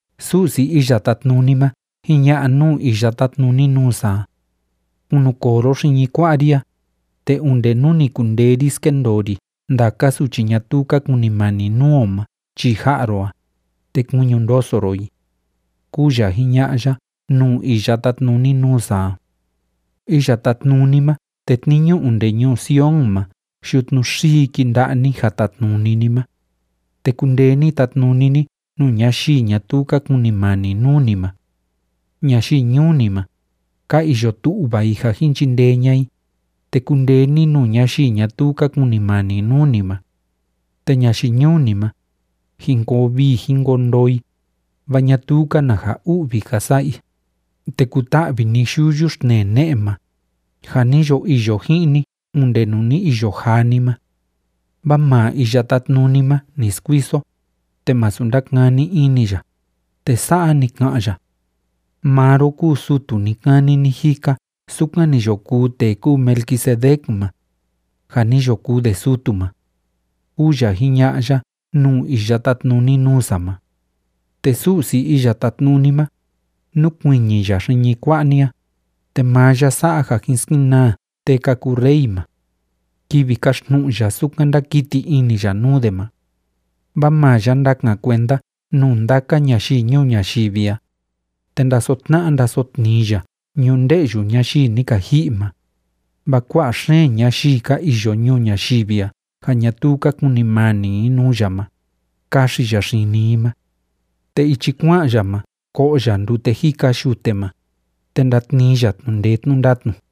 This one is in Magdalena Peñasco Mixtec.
Su'si Iya Tátnuni ma jiña'a nuu iya tátnuni nuu sa a: “Kunukoo ro xiñi kua'a ri a, te onde nú ni kundee ri skendoo ri ndaka suchi ñatuu ka kunimani nuu o ma chii ja'a ro a, te kuiñi ndoso ro i”, kúu ya jiña'a ya nuu iya tátnuni nuu sa a. Iya Tátnuni ma tetniñu onde ñuu Sion ma yutnu xii kinda'a ni ja tatnuni ni ma, te kundee ni tatnuni ni nuu ñayii ñatuu ka kunimani nuu ni ma. Ñayii ñuu ni ma, ka iyo tu'va i ja jin chindee ña'a i, te kundee ni nuu ñayii ñatuu ka kunimani nuu ni ma. Te ñayii ñuu ni ma, jin koo vii jin koo ndoo i, vaa ñatuu‑ka na ja u'vi ka sa'a i. Te kuta'vi ni yuyu xtnee ne'e ma, ja ni yo iyo ji'in ni onde nuu ni iyo jaa ni ma. Vaa maa Iya Tátnuni ma ni skuiso, te masu ndakani ini ya, te sa'a ni ka'an ya: “Maa ro kúu sutu ni‑kani ni‑jika sukan ni yo kuu tee kúu Melquisedec ma, ja ni yo kuu de sutu ma”, kúu ya jiña'a ya nuu iya tátnuni nuu sa ma. Te Su'si Iya Tátnuni ma, núkuiñi ya xiñi kua'a ni a, te maa ya sa'a ja jin skenaa tee ka kuu rey ma kivi kaxtnu'u ya sukan ndákiti ini ya nuu de ma. Vaa maa ya ndakan kuenda nuu ndaka ñayii ñuu ñayivi a, te ndasotna'a ndasotnii ya ñunde'yu ñayii ni ka ji'i ma, vaa kua'a xeen ñayii ka iyo ñuu ñayivi a ja ñatuu ka kunimani i nuu ya ma, kaxi ya xini i ma. Te ichi kua'an ya ma ko'o ya ndute jika yute ma, te ndatnii ya tnu'u ndee tnu'u ndatnu.